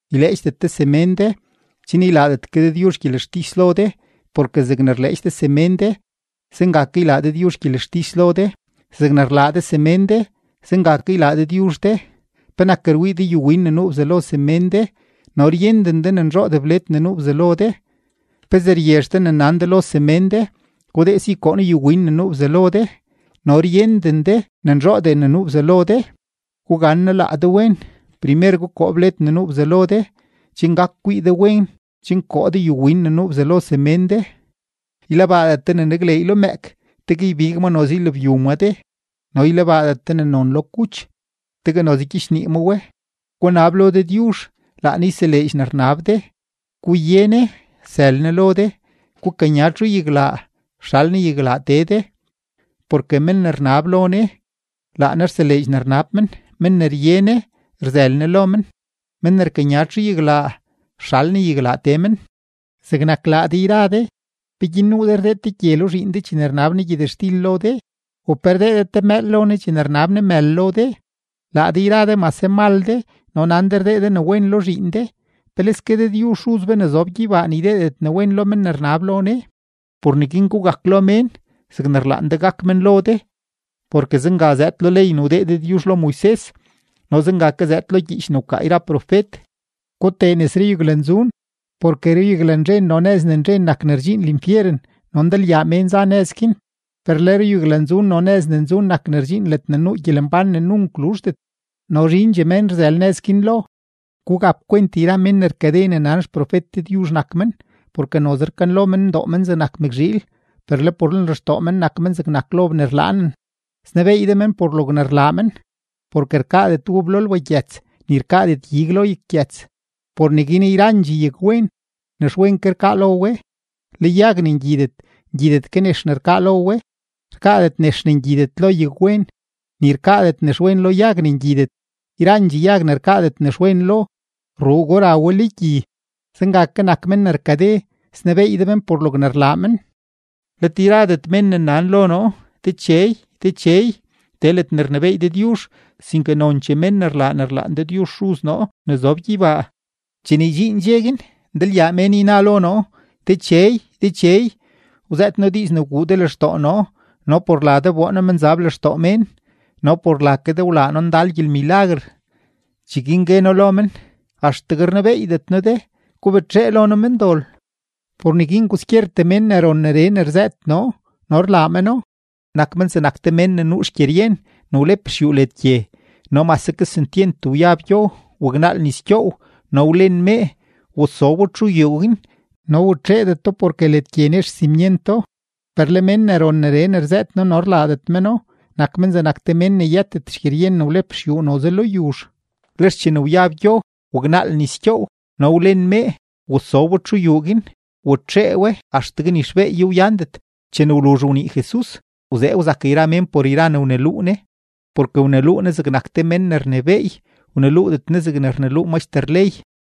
’Yleedxdet de semén de, chen ylaadet ke Dëdyuzh gyelextis lo de. Porke zegne rleedx de semén de, zenga ke ylaa Dëdyuzh gyelextis lo de; zegne rlaa de semén de, zenga ke ylaa Dëdyuzh de. ¿Penak rwii de yuwin ne nuu bzalo semén de no ryenden de ne nzhoodee bled ne nuu bzalo de? ¿Pezee ryezh de ne nan de lo semén de: “Gudee si koo noo yuwin ne nuu bzalo de”, no ryenden de ne nzhoodee ne nuu bzalo de? ¡Gugannaa laa de wen! Primer gukoo bled ne nuu bzalo de, chen gak kwii de wen chen koo de yuwin ne nuu bzalo semén de. ’Ylebaadet de ne nakleey lo mëëk, tegue ybig ma noze ylabyu maa de, no ylebaadet de ne non lo kuch, tegue noze gyichnii ma we. ’Gunab lo Dëdyuzh, laa Ne yseleedx ne rnab de; guye Ne, sël Ne lo de; gukanya txuyaglaa, sxal Ne yaglaa tee de. Porke men ne rnab lo Ne, laa Ne rseleedx ne rnab men; men ne rye Ne, rzël Ne lo men; men ne rkanya txuyaglaa, sxal Ne yaglaa tee men. ’Zegnak laa de yra de, ¿peguin nuu de rdee te gye lo zhiin de chene rnab ne gyëtxtil lo de? ¿U pe rdee de te mëël lo ne chene rnab ne mël lo de? Laa de yra de mase mal de no nan de rdee de ne wen lo zhiin de, ¡peleske Dëdyuzh Xuz be ne zob gyeybaa ne ydeedet ne wen lo men ne rnab lo Ne! ’Por neguin gugak lo mén zegne rlaan de ne gak men lo de, porke zenga zëëd lo ley ne wdee Dëdyuzh lo Moises no zenga ke zëëd lo gyiich ne wkaa yra profet. ’Gutee nes ruyaglanzun. Porke ruyaglanzhen no nëz ne nzhen nak ne rdxiin linfyeren, no ndalyaa mén za nëz guin. Per le ruyaglanzun no nëz ne nzun nak ne rdxiin ledne nuu gyelembán ne nunk luzhdet, no zhindxee mén rzël nëz guin lo. ’Gugap kwent yra mén ne rkade ne nan xprofet Dëdyuzh nak men. Porke noze rkanlo men ndoo men zegnak mëkzhiil, per le por lenlextoo men nak men zegnak lob ne rlaanen. Snebeey de men por logne rlaa men. Porke rkaadet ub lo lbagyëts, ni rkaadet ig lo yaggyëts. Por neguin yrandxee yagwen, nexwen rkaa lo we; le yag ne ngyidet, ngyidet ke nex ne rkaa lo we. Rkaadet nex ne ngyidet lo yagwen, ni rkaadet nexwen lo yag ne ngyidet. Yrandxee yag ne rkaadet nexwen lo, rruugo ra we lo gyi. Zenga ke nak men ne rkade, snebeey de men por logne rlaa men. ’Let yradet mén ne nan lo noo: “Dechey, Dechey”, tee ledne rnebééy Dëdyuzh, sinke nonchee mén ne rlaa ne rlaan Dëdyuzh Xuz noo ne zob gyeybaa. Chene ydxiin dxe guin, ndalyaa mén yna lo noo: “Dechey, Dechey, wzëët noo diiz ne wguu de lextoo noo, no por la de wboo noo menzab lextoo mén, no por la ke de wlaa noo ndal gyelmilaguer.” Cheguin gue noo lo men: “Axtegue rnebeeydet noo de; gubetxee lo noo, mendol.” ’Por neguin kwaskyertee men ne ron neree ne rzëët noo no rlaa meno, nak men zegnak te mén ne nuu xgyeryen ne wlep xyuu led gye. No mase kesentyent wyab gyo, waknaal nis gyoow no wlen mee, wasobo txu yuu guin, no watxeedeto porke led gye nex xsimyento. Per le men ne ron neree ne rzëët noo no rlaadet meno, nak men zegnak te mén ne yëtet xgyeryen ne wlep xyuu noze lo yuzh. Lex chene wyab gyo, waknaal nis gyoow no wlen mee, wasobo txu yuu guin, watxee we axtegue ni xbeeyo wyandet. Chene wluzh wnii Jesus, wzee wzak yra mén por yra ne wneluu Ne. Porke wneluu Ne zegnak te men ne rnebééy, wneluudet Ne zegne rneluu maxter ley.